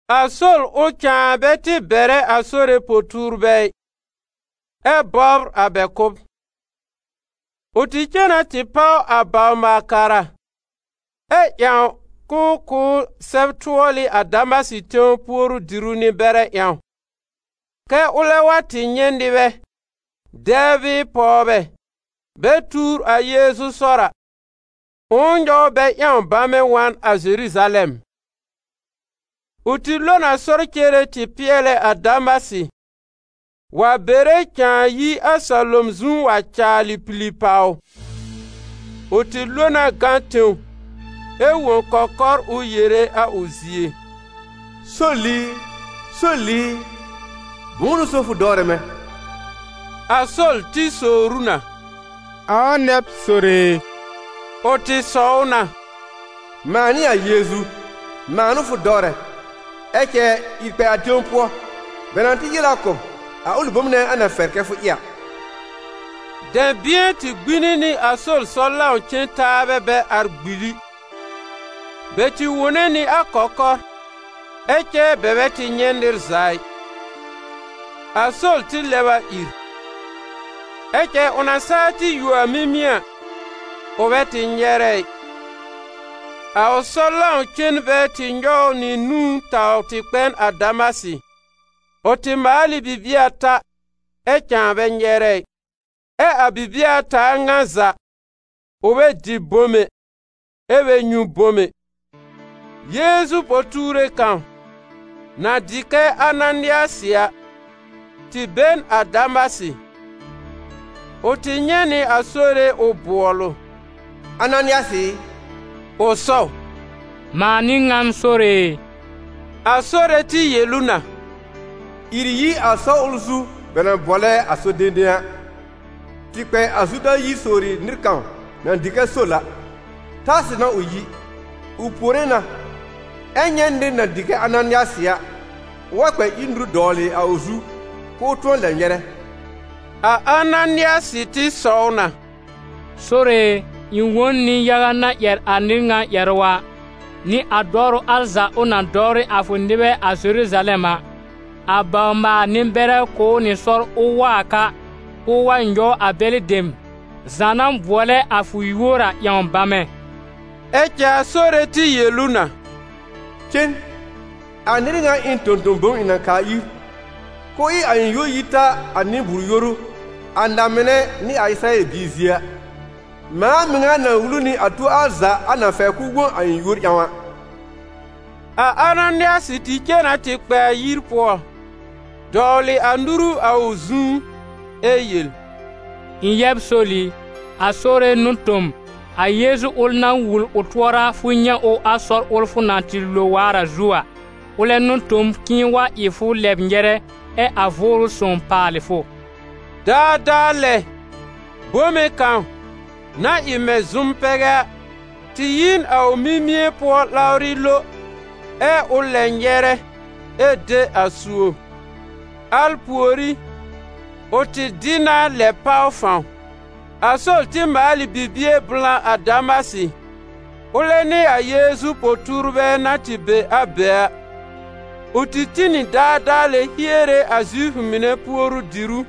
A Sol ʋl cãa bɛ tɩ bɛrɛ a Sore po-tuurbɛ ɩ, ɛ bɔbr a bɛ kʋ́b. Ʋ tɩ cen na tɩ páw a bawr-maal-kara, ɛ ƴãw ʋ kʋ̀ ʋ sɛb-tʋɔlɩ a Damasɩ tẽw puoru-diru nɩ-bɛrɛ ƴãw, kɛ́ ʋlɛ wa tɩ nyɛ̃ nɩbɛ, dɛbr bɩɩ pɔwbɛ, bɛ tuur a Yeezu sɔr a, ʋ̃ʋ nyɔw bɛ ƴãw bamɛ wa n a Zeruzalɛm. Ʋ tɩ lo n a sɔr cere tɩ pɩɛlɛ a Damasɩ, wa bere cãa yi a salom zu wa caalɩ pili pàw ʋ. Ʋ tɩ lo na gã tẽw ɛ wõ kɔkɔr ʋ yere a ʋ zie: «Sol i, Sol i, bʋ̃ʋ n'ʋ so fʋ dɔwrɛ mɛ̃?» A Sol tɩ sowr ʋ na: «Ãa nɛ b, Sore e?» Ʋ tɩ sɔw na: «Mãa n'ɩ a Yeezu, mãa n'ʋ fʋ dɔwrɛ. Ɛ cɛ ìr kpɛ a tẽw pʋɔ, bɛ na tɩ yel a kʋ̀ b a ʋlɩ bom nɛ a na fɛr kɛ fʋ ɩ a.» Dɛ̃bɩ̃ɛ tɩ gbĩni nɩ a Sol sɔr-lãw-cen-taabɛ bɛ ar gbili: bɛ tɩ wone nɩ a kɔkɔr, ɛ cɛ bɛ bɛ tɩ nyɛ̃ nɩr za ɩ. A Sol tɩ lɛb a ìr. Ɛ cɛ ʋ na saa tɩ yuo a mimie a, ʋ bɛ tɩ nyɛrɛ ɩ. A ʋ sɔr-lãw-cenbɛ tɩ nyɔw ʋ nɩ nũú taw tɩ kpɛn a Damasɩ. Ʋ tɩ maal ɩ bibie ata, ɛ cãa bɛ nyɛrɛ ɩ. Ɛ a bibie ata a ŋa za ʋ bɛ dɩ bom ɛ, ɛ bɛ nyũ bom ɛ. Yeezu po-tuure kãw, na dɩ kɛ Ananɩasɩ a, tɩ be n a Damasɩ. Ʋ tɩ nyɛ̃ nɩ a Sore ʋ bʋɔl ʋ: «Ananɩasɩ ɩ!» Ʋ sɔw: «Mãa n'ɩ ŋan Sore e.» A Sore tɩ yel ʋ na: «Ìr yi a sɔr ʋl zu bɛ na bʋɔlɛ a ‹Sɔr-dẽdẽ› a, tɩ kpɛ a Zuda yir sowri nɩr kãw na dɩ kɛ Sol a, Tarsɩ n'a ʋ yi. Ʋ puore na, ɛ nyɛ̃ nɩr na dɩ kɛ Ananɩasɩ a, ʋ wa kpɛ ír nuru dɔwlɩ a ʋ zu k'ʋʋ tʋ̃ɔ lɛ nyɛrɛ.» A Ananɩasɩ tɩ sɔw na: «Sore e, ɩ̃ wõ n nɩ-yaga na ƴɛr a nɩr ŋa ƴɛrʋ a, nɩ a dɔwrʋ al za ʋ na dɔwrɩ a fʋ nɩbɛ a Zeruzalɛm a. A bawr-maal-nɩ-bɛrɛ kʋ̀ ʋ nɩ sɔr ʋ wa a ka, k'ʋʋ wa nyɔw a bɛlɩ dem za na bʋɔlɛ a fʋ yúor a ƴãw bamɛ.» Ɛ cɛ a Sore tɩ yel ʋ na: «Cen, a nɩr ŋa ɩ n tõ-tõ-bom ɩ̃ na kaa ir k'ʋʋ ɩ a ɩ̃ yúor yi ta a nɩ-bʋʋr-yoru, a na-mɩnɛ nɩ a Ɩsɩrayɛl biir zie a. Mãa mɩŋa na wul ʋ nɩ a tuo al za a na fɛr k'ʋʋ wõ a ɩ̃ yúor ƴãw a.» A Ananɩasɩ tɩ cen na tɩ kpɛ a yir pʋɔ, dɔwlɩ a nuru a ʋ zu ɛ yel: «Ɩ̃ yɛb Sol i, a Sore n'ʋ tõ m. A Yeezu ʋl na wul ʋ tʋɔra fʋ nyɛ̃ ʋ a sɔr ʋl fʋ na tɩ lo waar a zu a, ʋlɛ n'ʋ tõ m k'ɩ̃ɩ wa ɩ fʋ lɛb nyɛrɛ ɛ a Vʋʋrʋ Sõw paalɩ fʋ.» Daadaa lɛ bome kãw, na ɩ mɛ̃ zʋm-pɛgɛ a, tɩ yi n a ʋ mimie pʋɔ lawrɩ lo, ɛ ʋ lɛb nyɛrɛ ɛ de a suob. Al pùorí, ʋ tɩ dɩ na lɛb páw fãw. A Sol tɩ maal ɩ bibie blã a Damasɩ, ʋlɛ nɩ a Yeezu po-tuurbɛ na tɩ be a be a. Ʋ tɩ tĩ nɩ daadaa lɛ hiere a Zifʋ mɩnɛ puoru-dìrú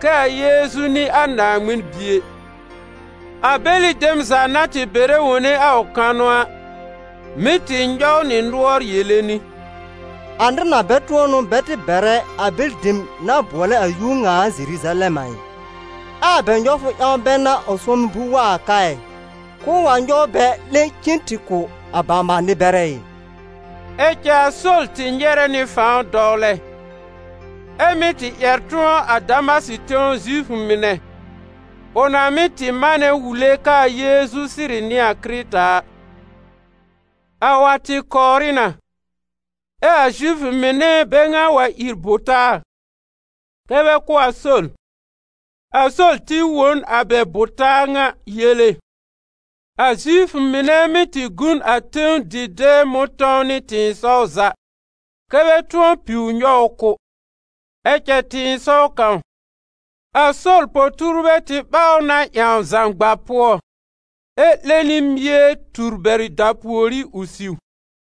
kɛ a Yeezu n'ɩ a Naaŋmɩn Bie. A bɛlɩ dem za na tɩ bɛrɛ wone a ʋ kanʋ a, mɩ́ tɩ nyɔw nɩ nʋɔr yere nɩ: «A nɩr ŋa bɛ tʋ̃ɔ n'ʋ bɛ tɩ bɛrɛ a bɛlɩ dem na bʋɔlɛ a Yúor ŋa a Zeruzalɛm a ɩ? Ɛ a bɛ nyɔwfʋ ƴãw bɛ n'a ʋ sʋ̃ɔmɩ bul wa a ka, k'ʋʋ wa nyɔw bɛ 'lẽ cen nɩ tɩ kʋ̀ a bawr-maal-nɩ-bɛrɛ ɩ?» Ɛ cɛ a Sol tɩ nyɛrɛ nɩ fãw dɔwlɛ, ɛ́ mɩ́ tɩ ƴɛr tʋ̃ɔ a Damasɩ tẽw Zifʋ mɩnɛ, ʋ na mɩ́ tɩ manɛ wule k'aa Yeezu sɩrɩ n'ɩ a Kɩrɩta a. A wa tɩ kɔwrɩ na, ɛ a Zifʋ mɩnɛ bɛ ŋa wa ír bʋ taa kɛ́ bɛ kʋ́ a Sol. A Sol tɩ wõ n a bɛ bʋ-taa ŋa yele. A Zifʋ mɩnɛ mɩ́ tɩ gu n a tẽw dɩ̃dɛɛ mʋ̃tɔ̃w nɩ tɩ̃ɩsɔw za, kɛ́ bɛ tʋ̃ɔ piw nyɔw ʋ kʋ́. Ɛ cɛ tɩ̃ɩsɔw kãw, a Sol po-tuurbɛ tɩ ɓaw ʋ na ƴãw zãgba pʋɔ ɛ 'lẽ nɩ mie tur bɛr dapùorí ʋ siw.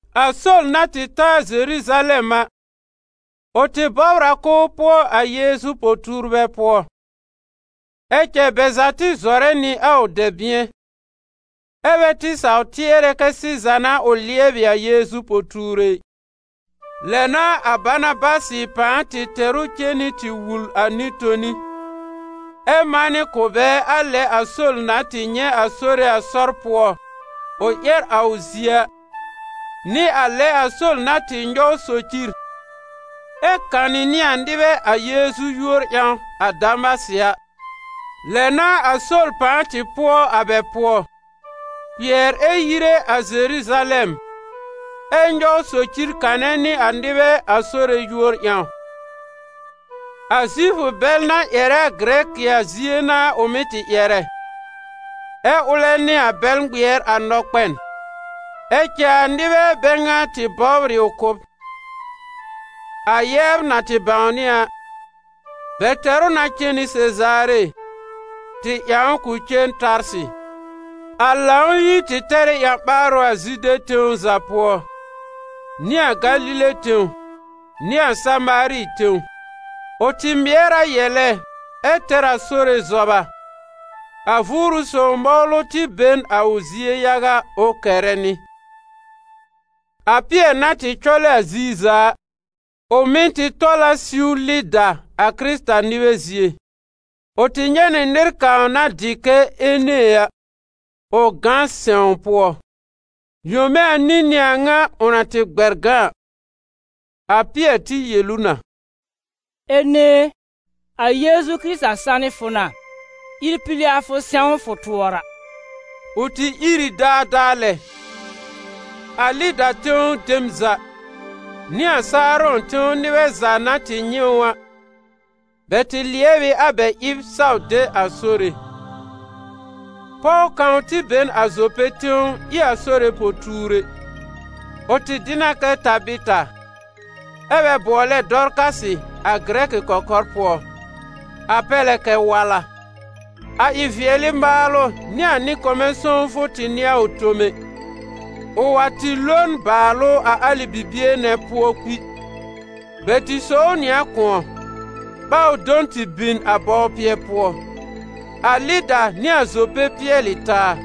A Sol na tɩ ta a Zeruzalɛm a, ʋ tɩ bɔbr a k'ʋʋ pʋɔ a Yeezu po-tuurbɛ pʋɔ; ɛ cɛ bɛ za tɩ zɔrɛ nɩ a ʋ dɛ̃bɩ̃ɛ, ɛ bɛ tɩ saw tɩɛrɛ kɛ sɩza n'a ʋ lɩɛbɩ a Yeezu po-tuure ɩ. Lɛ n'a a Banabasɩ pãa tɩ tɛr ʋ cen nɩ tɩ wul a nɩ-toni, ɛ manɩ kʋ̀ bɛ a lɛ a Sol na tɩ nyɛ̃ a Sore a sɔr pʋɔ ʋ ƴɛr a ʋ zie a, nɩ a lɛ a Sol na tɩ nyɔw socir ɛ kanɩ nɩ a nɩbɛ a Yeezu yúor ƴãw a Damasɩ a. Lɛ n'a a Sol pãa tɩ pʋɔ a bɛ pʋɔ, kpɩɛr ɛ yire a Zeruzalɛm, ɛ nyɔw socir kanɛ nɩ a nɩbɛ a Sore yúor ƴãw. A Zifʋ bɛl na ƴɛrɛ a Gɩrɛkɩ a zie n'a ʋ mɩ́ tɩ ƴɛrɛ, ɛ ʋlɛ nɩ a bɛl ŋmɩɛr a nɔkpɛn. Ɛ cɛ a nɩbɛ bɛ ŋa tɩ bɔbr ɩ ʋ kʋ́b. A yɛbr na tɩ bãwnɩ a, bɛ tɛr ʋ na cen nɩ Sezaare, tɩ ƴãw k'ʋ cen Tarsɩ. A Lãw-yir tɩ tɛr ɩ ƴã-ɓaarʋ a Zude tẽw za pʋɔ, nɩ a Galile tẽw nɩ a Samaari tẽw; ʋ tɩ mɩɛr a yɛlɛ ɛ tɛr a Sore zɔba, a Vʋʋrʋ Sõw mɔwlʋ tɩ be n a ʋ zie yaga ʋ kɛrɛ nɩ. A Pɩɛr na tɩ cɔlɛ a ziir za a, ʋ mɩ̀ tɩ tɔl a siw a Lɩda a Kɩrɩta-nɩbɛ zie. Ʋ tɩ nyɛ̃ nɩ nɩr kãw na dɩ kɛ Ene a, ʋ gã sɛ̃w pʋɔ. Yome anĩ n'ɩ a ŋa ʋ na tɩ gbɛr gã a. A Pɩɛr tɩ yel ʋ na: «Ene e, a Yeezu Kɩrɩta sanɩ fʋ na; ìr pili a fʋ sɛ̃w fʋ tʋɔra.» Ʋ tɩ ìr ɩ daadaa lɛ. A Lɩda tẽw dem za, nɩ a Saarɔ̃ tẽw nɩbɛ za na tɩ nyɛ̃ ʋ a, bɛ tɩ lɩɛb ɩ a bɛ ɩb saw de a Sore. Pɔw kãw tɩ be n a Zope tẽw ɩ a Sore po-tuure. Ʋ tɩ dɩ na kɛ Tabɩta, ɛ́ bɛ bʋɔlɛ Dɔrkasɩ a gɩrɛkɩ kɔkɔr pʋɔ, a pɛr lɛ kɛ Wala. A ɩ-vɩɛlɩ maalʋ nɩ a nɩ-kɔmɛ sõwfʋ tɩ n'ɩ a ʋ tome. Ʋ wa tɩ lo n bàalʋ a alɩ bibie nɛ pʋɔ kpi. Bɛ tɩ sò ʋ nɩ a kʋ̃ɔ, ɓaw do n tɩ bin a bɔwpɩɛ pʋɔ. A Lɩda nɩ a Zope pɩɛl ɩ taa.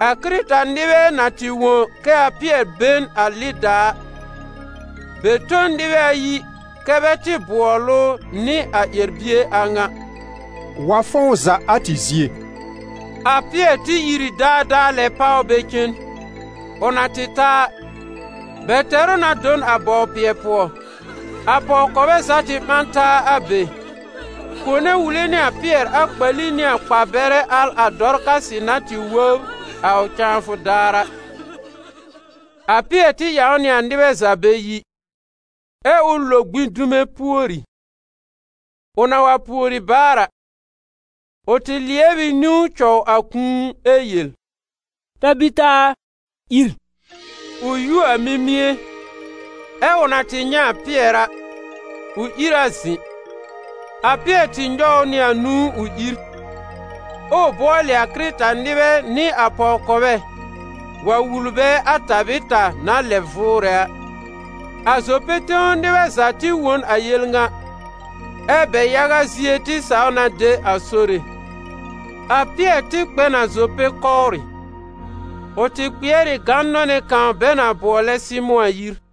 A Kɩrɩta-nɩbɛ na tɩ wõ kɛ a Pɩɛr be n a Lɩda a, bɛ tõ n nɩbɛ ayi kɛ́ bɛ tɩ bʋɔl ʋ nɩ a ƴɛr-bie a ŋa: «Wa fɔ̃w za a tɩ zie.» A Pɩɛr tɩ ìr ɩ daadaa lɛ páw bɛ cen. Ʋ na tɩ ta a, bɛ tɛr ʋ na do n a bɔwpɩɛ pʋɔ. A pɔw-kɔbɛ za tɩ ɓã n taa a be, kone wule nɩ a Pɩɛr a kpali nɩ a kpar-bɛrɛ al a Dɔrkasɩ na tɩ wóbr a ʋ cãafʋ daar a. A Pɩɛr tɩ ƴãw nɩ a nɩbɛ za bɛ yi, ɛ ʋ lo gbĩ dume pùori. Ʋ na wa pùori baar a, ʋ tɩ lɩɛb ɩ niwn cɔw a kũu ɛ yel: «Tabɩta a, ìr!» Ʋ yuo a mimie, ɛ ʋ na tɩ nyɛ̃ a Pɩɛr a, ʋ ìr a zɩ̃. A Pɩɛr tɩ nyɔw ʋ nɩ nũú ʋ ìr, ʋʋ bʋɔlɩ a Kɩrɩta-nɩbɛ nɩ a pɔw-kɔbɛ wa wul bɛ a Tabɩta na lɛb vʋʋrɛ a. A Zope tẽw nɩbɛ za tɩ wõ n a yel ŋa, ɛ́ bɛ yaga zie tɩ saw na de a Sore. A Pɩɛr tɩ kpɛ n a Zope kɔwrɩ. Ʋ tɩ kpɩɛr ɩ gãn-nɔnɛ́ kãw bɛ na bʋɔlɛ Sɩmʋ̃ a yir.